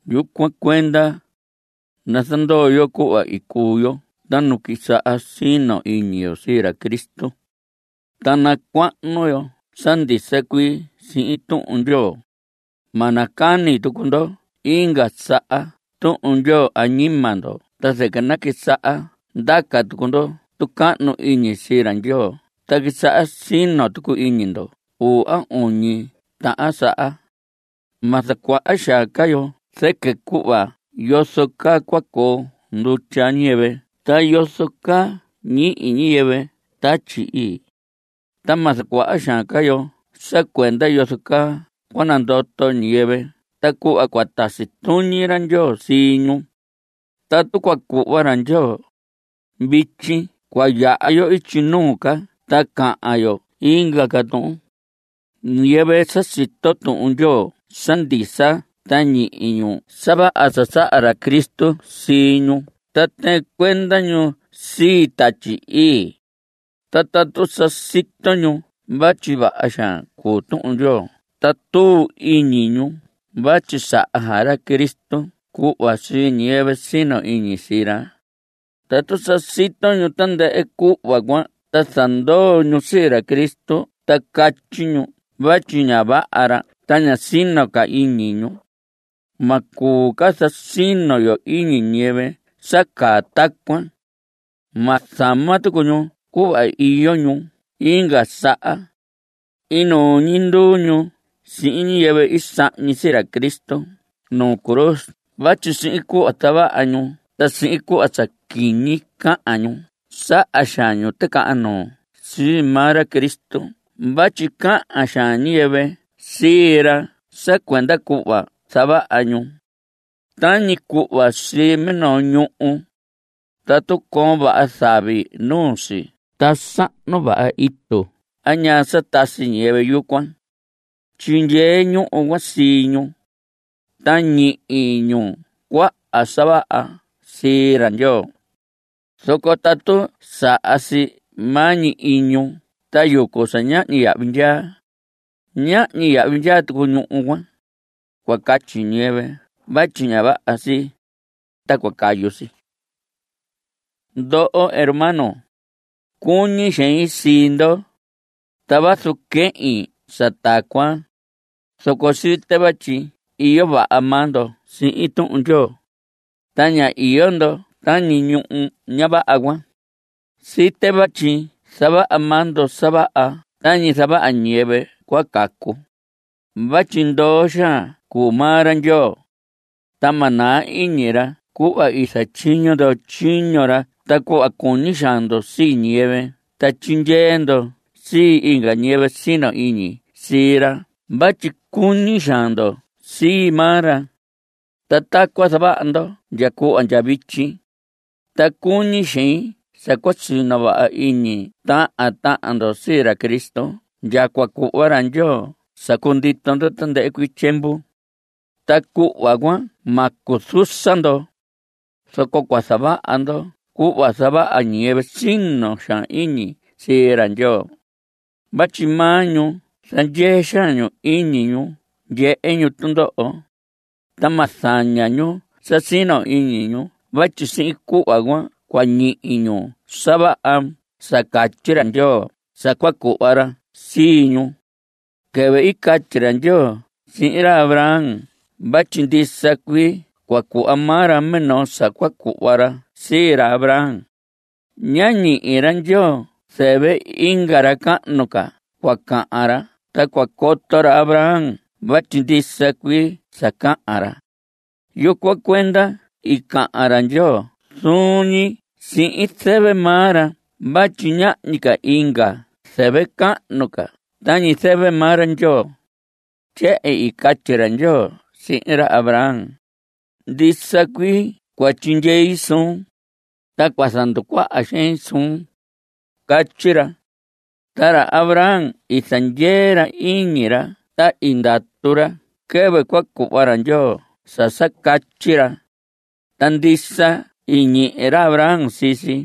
Yucuan cuenda, nazandoo yo cuhva i cuu yo ta nu quisaha sino iñi yo sii ra Cristo, ta nacuahnu yo sa ndisa cuii sihin Tuhun Ndyoo. Ma nacani tucu ndo inga saha Tuhun Ndyoo añima ndo ta zɨquɨ naquisaha ndaca tucu ndo tucahnu iñi sii ra Ndyoo ta quisaha sino tucu iñi ndo uu a uñi tahan saha. Ma zacuaha xaan ca yo zɨquɨ cuhva yozo caa cua coo ndutya ñiyɨvɨ ta yozo caa ñihi ñiyɨvɨ Tatyi Ii. Ta ma zacuaha xaan ca yo sa cuenda yozo caa cua nandoto ñiyɨvɨ ta cuhva cua tasi tuñi ra Ndyoo sii ñu. Tatu cua cuhva ra Ndyoo, vityi cua yaha yo ityi nuu ca ta cahan yo inga ca tuhun. Ñiyɨvɨ sa sito Tuhun Ndyoo sa ndisa ta ñihi ñu sa vaha sa saha ra Cristo sii ñu ta tɨɨn cuenda ñu sii Tatyi Ii, ta tatu sa sito ñu vatyi vaha xaan cuu Tuhun Ndyoo ta tuu iñi ñu vatyi saha xaan ra Cristo cuhva sii ñiyɨvɨ sino iñi sii ra. Tatu sa sito ñu tandɨhɨ cuhva cuan ta zandoo ñu sii ra Cristo ta catyi ñu vatyi ña vaha ra ta ña sino ca iñi ñu, ma cuu ca zasino yo iñi ñiyɨvɨ sa caa tacuan. Ma zama tucu ñu cuhva iyo ñu inga saha. Inuu ñi nduu ñu sihin ñiyɨvɨ i sahñi sii ra Cristo nuu cruz vatyi sihin cuhva zavaha ñu ta sihin cuhva sa quiñi cahan ñu saha xaan ñu ticahan nuu sii maa ra Cristo vatyi cahan xaan ñiyɨvɨ sii ra sa cuenda cuhva zavaha ñu. Tañi cuhva sii minoo ñuhu. Tatu coon vaha zavi nuu si ta sahnu vaha itu a ñaa sa tasi ñiyɨvɨ yucuan, tyindyee ñuhu cuan sii ñu, ta ñihi ñuhu cuan sa vaha sii ra Ndyoo. Zoco tatu saha si maa ñi iñu ta yucu sa ñahñi yahvi ndyaa, ñahñi yahvi ndyaa tucu ñuhu cuan. Cua catyi ñiyɨvɨ vatyi ña vaha si, ta cua cayu si. Ndoho hermanos, cuñi xein sii ndo, ta vazu quehin sa tacuan, zoco site vatyi iyo vaha maa ndo sihin Tuhun Ndyoo, ta ña iyo ndo tañi ñuhu ña vaha cuan. Site vatyi zavaha maa ndo sa vaha tañi zavaha ñiyɨvɨ cua cacu. Vatyi ndoo xaan cuu maa ra Ndyoo, ta ma naa iñi ra cuhva i zatyiño ndo tyiño ra ta cuhva cuñi xaan ndo sii ñiyɨvɨ ta tyindyee ndo sii inga ñiyɨvɨ sino iñi sii ra vatyi cuñi xaan ndo sii maa ra. Ta tacuan zavaha ndo ndya cuhva ndya vityi. Ta cuñi xein sa cua sino vaha iñi tahan tahan ndo sii ra Cristo ndya cua cuhva ra Ndyoo sa cundito ndo tandɨhɨ cuii tyiemvu. Ta cuhva cuan ma cuzusa ndo, zoco cua zavaha ndo cuhva zavaha ñiyɨvɨ sino xaan iñi sii ra Ndyoo. Vatyi maa ñu zandyee xaan ñu iñi ñu ndyehe ñu tundoho, ta ma zaña ñu sa sino iñi ñu vatyi sihin cuhva cuan cua ñihi ñu sa vaha sa catyi ra Ndyoo sa cua cuhva ra sii ñu. Quɨvɨ i catyi ra Ndyoo sihin ra Abraham vatyi ndisa cuii cua cuhva maa ra minoo sa cua cuhva ra sii ra Abraham, ñá ñihi ra Ndyoo zɨvɨ inga ra cahnu ca cua cahan ra ta cua coto ra Abraham vatyi ndisa cuii sa cahan ra. Yucuan cuenda i cahan ra Ndyoo zuun ñi sihin zɨvɨ maa ra vatyi ñahñi inga ca zɨvɨ cahnu ca tañi zɨvɨ maa ra Ndyoo. Tyehen i catyi ra Ndyoo sihin ra Abraham: “Ndisa cuii cua tyindyei suun, ta cua zanducuaha xein suun.” Catyi ra. Ta ra Abraham i zandyee ra iñi ra ta i ndatu ra quɨvɨ cua cuhva ra Ndyoo sa sa catyi ra. Ta ndisa i ñihi ra Abraham sii si.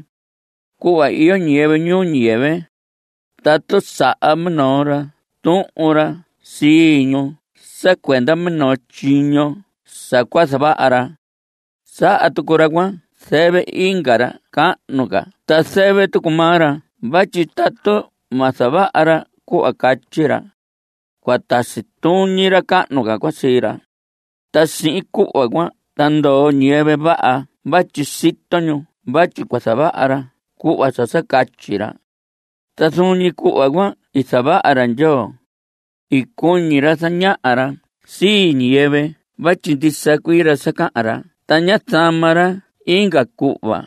Cuhva iyo ñiyɨvɨ ñuu ñiyɨvɨ, tatu saha minoo ra tuhun ra sii ñu sa cuenda minoo tyiño sa cua zavaha ra, saha tucu ra cuan zɨvɨ inga ra cahnu ca ta zɨvɨ tucu maa ra vatyi tatu ma zavaha ra cuhva catyi ra, cua tasi tuñi ra cahnu cuan sii ra. Ta sihin cuhva cuan ta ndoo ñiyɨvɨ vaha vatyi sito ñu vatyi cua zavaha ra cuhva sa sa catyi ra. Ta zuun ñi cuhva cuan i zavaha ra Ndyoo. I cuñi ra zañaha ra sii ñiyɨvɨ vatyi ndisa cuii ra sa cahan ra ta ña zama ra inga cuhva,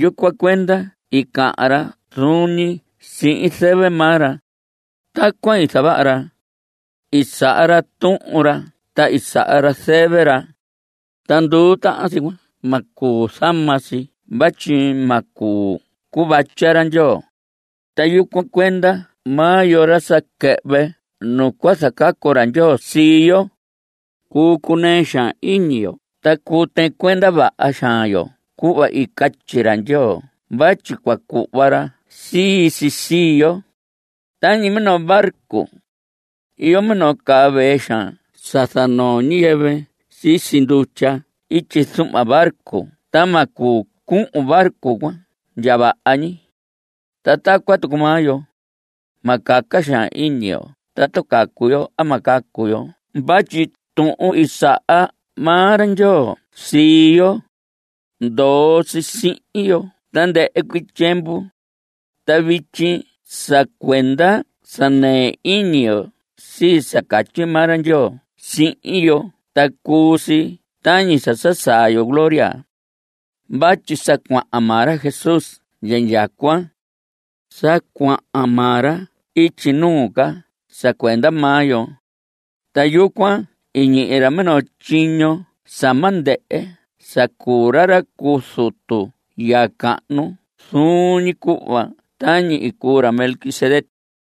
yucuan cuenda i cahan ra zuun ñi sihin zɨvɨ maa ra. Tacuan i zavaha ra. I saha ra tuhun ra ta i saha ra zɨvɨ ra, ta nduu tahan si cuan ma cuu zama si vatyi ma cuu cuvatya ra Ndyoo. Ta yucuan cuenda maa yo, ra sa quɨhvɨ nu cua zacacu ra Ndyoo sii yo, cuu cunɨɨ xaan iñi yo ta cuu tɨɨn cuenda vaha xaan yo cuhva i catyi ra Ndyoo vatyi cua cuhva ra sii si sii yo. Tañi minoo barco, iyo minoo caa vee xaan sa zanoo ñiyɨvɨ sisi ndutya ityi zuhma barco ta ma cuu cuhun barco cuan ndya vaha ñi. Ta tacuan tucu maa yo. Ma caca xaan iñi yo tatu cacu yo a ma cacu yo vatyi tuhun i saha maa ra Ndyoo sii yo, ndoo si sihin yo tandɨhɨ cuii tyiemvu. Ta vityi sa cuenda sa nɨɨ iñi yo sii sa catyi maa ra Ndyoo sihin yo ta cuu si tañi sa sá saa yo gloria vatyi sa cuahan maa ra Jesús ndya indyacuan. Sa cuahan maa ra ityi nuu ca sa cuenda maa yo. Ta yucuan i ñihi ra minoo tyiño sa ma ndɨhɨ sa cuu ra ra cu zutu ya cahnu zuun ñi cuhva tañi i cuu ra Melquisedec.